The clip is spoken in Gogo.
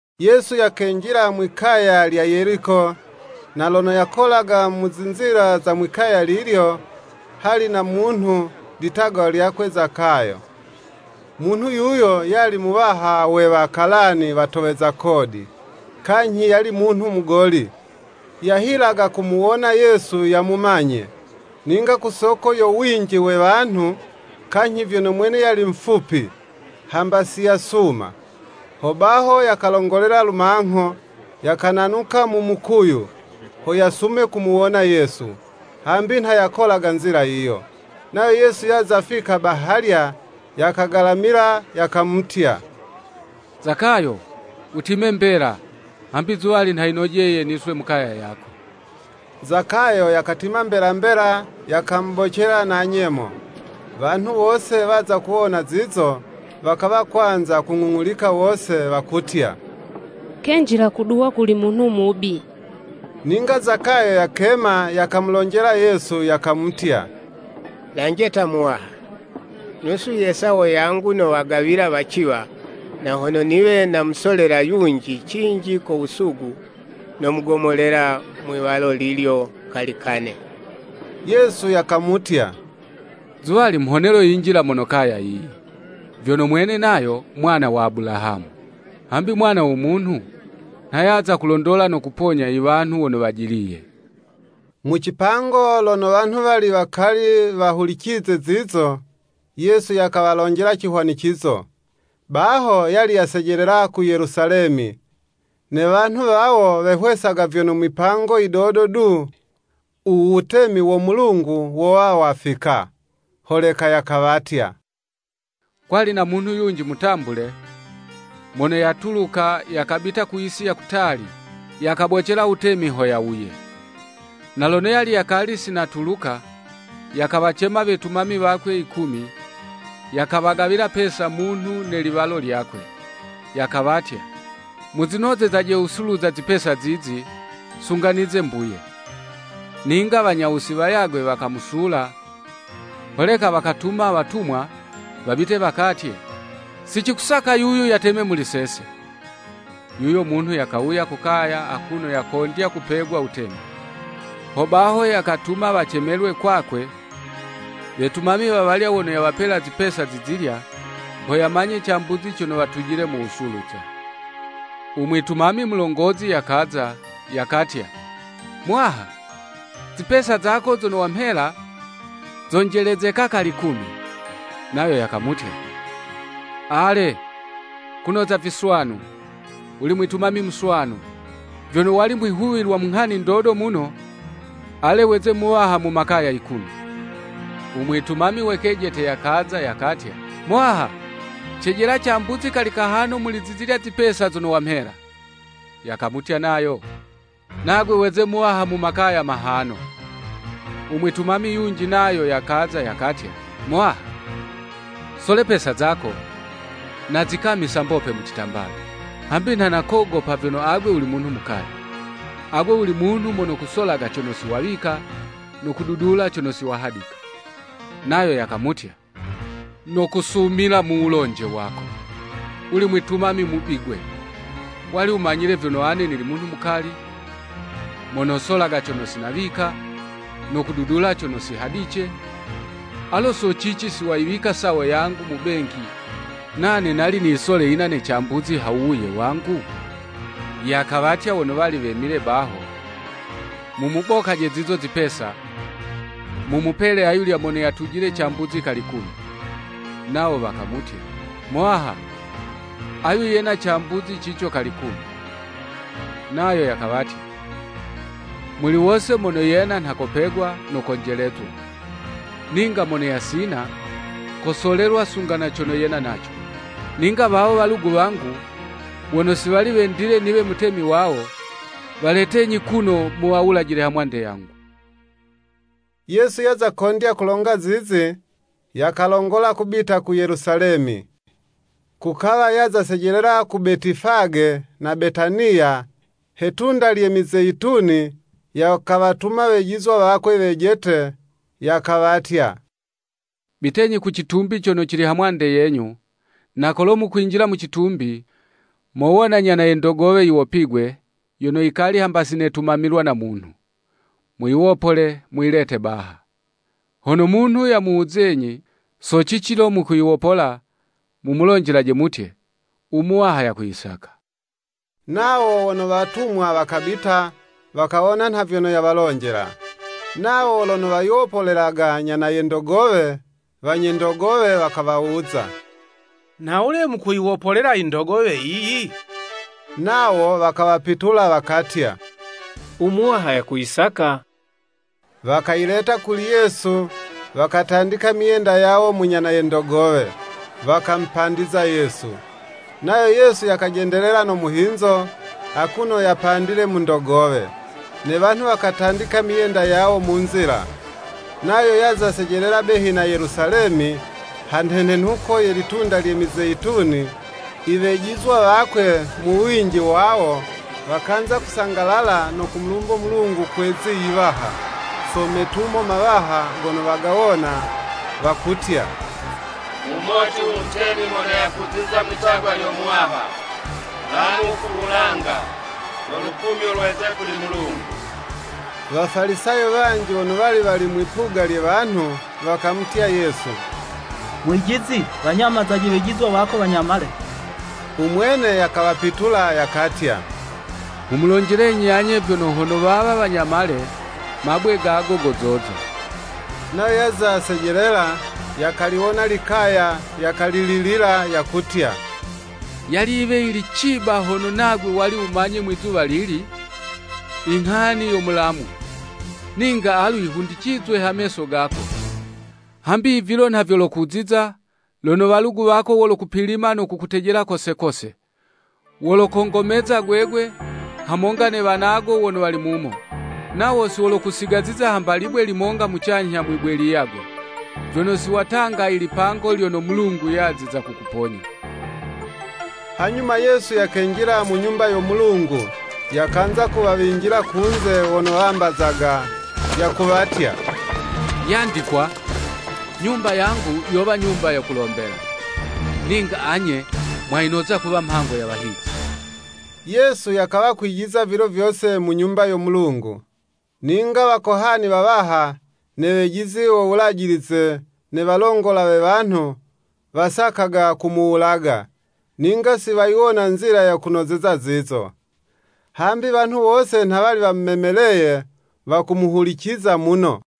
Yesu yakenjila mwi'kaya lya Yeliko, na lono yakolaga mu zinzila za mwi'kaya lilyo, hali na munhu, litagwa lyakwe Zakayo. Munhu yuyo yali muwaha we Wakalani watoweza kodi, kanyhi yali munhu mugoli. Yahilaga kumuwona Yesu yamumanye; ninga ku soko yo winji we wanhu, kanyhi vyono mwene yali mufupi; hamba siyasuma. Hobaho yakalongolela lumangho, yakananuka mu mukuyu, ho yasume kumuwona Yesu, hambi nha yakolaga nzila yiyo. Nayo Yesu yaza fika bahalya, yakagalamila, yakamutya, “Zakayo wutime mbela, hambi zuwali nha yinojeye niswe mu kaya yako.” Zakayo yakatima mbela mbela, yakamubocela na nyemo. Wanhu wose waza kuwona zizo, wakawa kwanza kung'ung'ulika wose, wakutya, “Kenjila kuduwa kuli munhu mubi.” Ninga Zakayo yakema, yakamulonjela Yesu, yakamutya, “Lanje ta, Muwaha, Nusu ye sawo yangu nowagawila waciwa; na hono niwe namusolela yunji cinji ko wusugu, nomugomolela mwi'walo lilyo kali kane.” Yesu yakamutya, “Zuwali mhonelo yinjila mono kaya yiyi, vyono mwene nayo, mwana wa Abulahamu. Hambi Mwana wo Munhu nha yaza kulondola no kuponya i wanhu wono wajiliye.” Mu cipango lono wanhu wali wakali wahulicize zizo, Yesu yakawalonjela cihwanicizo. (Baho yali yasejelela ku Yelusalemi, ne wanhu wawo wehwesaga vyono mwipango yidodo du, u wutemi wo Mulungu wowa wafika.) Holeka yakawatya, “Kwali na munhu yunji mutambule, mono yatuluka, yakabita ku yisi ya kutali, yakabocele wutemi ho yawuye. Na lono yali yakali si natuluka, yakawacema wetumami wakwe yikumi, yakawagawila pesa munhu ne liwalo lyakwe, yakawatya. ‘Muzinozezaje wusuluza zipesa zizi, sunga nize mbuye.’ Ninga wanya wusi wayagwe wakamusula, holeka wakatuma watumwa, wabite wakatye. ‘Si cikusaka yuyu yateme muli sese.’ “Yuyo munhu yakawuya ku kaya akuno yakondya kupegwa wutemi. Ho baho yakatuma wacemelwe kwakwe wetumami wawalya wono yawapela zipesa zizilya, ho yamanye cambuzi cono watujile mu wusuluza. U mwitumami mulongozi yakaza, yakatya, ‘Muwaha, zipesa zako zono wamhela, zonjelezeka kali kumi.’ Nayo yakamutya, ‘Ale, kunoza viswanu, wuli mwitumami muswanu. Vyono wali mwihuwilwa mu nghani ndodo muno, ale weze muwaha mu makaya kumi.’ U mwitumami we kejete yakaza, yakatya, ‘Muwaha, cijela cambuzi kali kahano muli zizilya zipesa zono wukamhela.’ Yakamutya nayo, ‘Nagwe weze muwaha mu makaya mahano.’” U mwitumami yunji nayo yakaza yakatya, “Muwaha sole pesa zako, nazikamisa mbope mu citambala, hambi nha nakogopa vyono agwe wuli munhu mukali. Agwe wuli munhu mono kusolaga cono si wawika, no kududula cono si wahadika.” Nayo yakamutya, “Nokusumila mu wulonje wako, wuli mwitumami mubi 'gwe. Wali wumanyile vyono ane nili munhu mukali, mono solaga cono sinawika, no kududula cono si hadice, alo so cici si wayiwika sawo yangu mu benki, nane nali niyisole yina ne cambuzi ha wuwuye wangu?” Yakawatya wono wali wemile baho, “Mumubokaje zizo zipesa, mumupele ayulya mono yatujile cambuzi kali kumi.” Nawo wakamutya, “Muwaha, ayu yena cambuzi cico kali 'kumi.” Nayo yakawatya, “Muli wose mono yena nha kopegwa; no konjelezwa. Ninga mono yasina, kosolelwa sunga na cono yena naco. Ninga wawo walugu wangu, wono si wali wendile niwe mutemi wawo, waletenyi kuno, muwawulajile hamwande yangu.” Yesu yaza kondya kulonga zizi, yakalongola kubita ku Yelusalemi. Kukawa yaza sejelela ku Betifage na Betaniya, he 'tunda lye Mizeyituni, yakawatuma wejizwa wakwe wejete, yakawatya, “Bitenyi ku citumbi cono cili ha mwande yenyu, na kolo mukwinjila mu citumbi, mowona nyana ye ndogowe yiwopigwe, yono yikali hamba si netumamilwa na munhu. Muyiwopole, muyilete baha.” Hono munhu yamuwuzenyi, so cici lo mukuyiwopola, mumulonjelaje mutye, “U Muwaha yakuyisaka.” Nawo wono watumwa wakabita, wakawona nha vyono yawalonjela. Nawo lono wayiwopolelaga nyana ye ndogowe, wanye ndogowe wakawawuza, “Nhawule mukuyiwopolela i ndogowe yiyi?” Nawo wakawapitula, wakatya, “U Muwaha yakuyisaka.” Wakayileta kuli Yesu, wakatandika myenda yawo mu nyana ye ndogowe, wakamupandiza Yesu. Nayo Yesu yakajendelela no muhinzo, akuno yapandile mu ndogowe, ne wanhu wakatandika myenda yawo mu nzila. Nayo yaza sejelela behi na Yelusalemi, ha nhenenhuko ye litunda lye Mizeyituni, i wejizwa wakwe mu winji wawo, wakanza kusangalala no kumulumbo Mulungu kwe 'zi yiwaha, so metumo mawaha gono wagawona, wakutya, “Mumoti u Mutemi mono yakuziza mwitagwa lyo Muwaha, Mulamu ku wulanga, no lukumyo lweze kuli Mulungu.” Wafalisayo wanji wono wali wali mwi'puga lye wanhu, wakamutya Yesu, “Mwijizi wanyamazaje wejizwa wako wanyamale.” U mwene yakawapitula, yakatya, “Nghumulonjelenyi anye vyono, hono wawa wanyamale, mabwe gago gozoza.” Nayo yaza sejelela, yakaliwona likaya yakalililila, yakutya, “Yali yiwe yili ciba hono nagwe wali wumanye mwizuwa lili, inghani yo mulamu! Ninga alu yihundicizwe ha meso gako. Hambi vilo nha vyolokuziza, lono Walugu wako wolokupilima no kukutejela kose kose. Wolokongomeza gwegwe, hamonga ne wanago wono wali mumo. Nawo si wolokusigaziza hamba libwe limonga mucanyha mwibwe liyagwe, vyono si watanga ilipango lyono Mulungu yaziza kukuponya.” Hanyuma Yesu yakenjila mu Nyumba yo Mulungu, yakanza kuwawinjila kunze wono wambazaga, yakuwatya, “Yandikwa, Nyumba yangu yowa nyumba yo kulombela; ninga anye mwayinoza kuwa mhango ya Wahizi.” Yesu yakawa kwijiza vilo vyose mu Nyumba yo Mulungu. Ninga Wakohani wawaha, ne wejizi wo Wulajilize ne walongola we wanhu, wasakaga kumuwulaga, ninga si wayiwona nzila yo kunozeza zizo. Hambi wanhu wose nha wali wamumemeleye, wakumuhuliciza muno.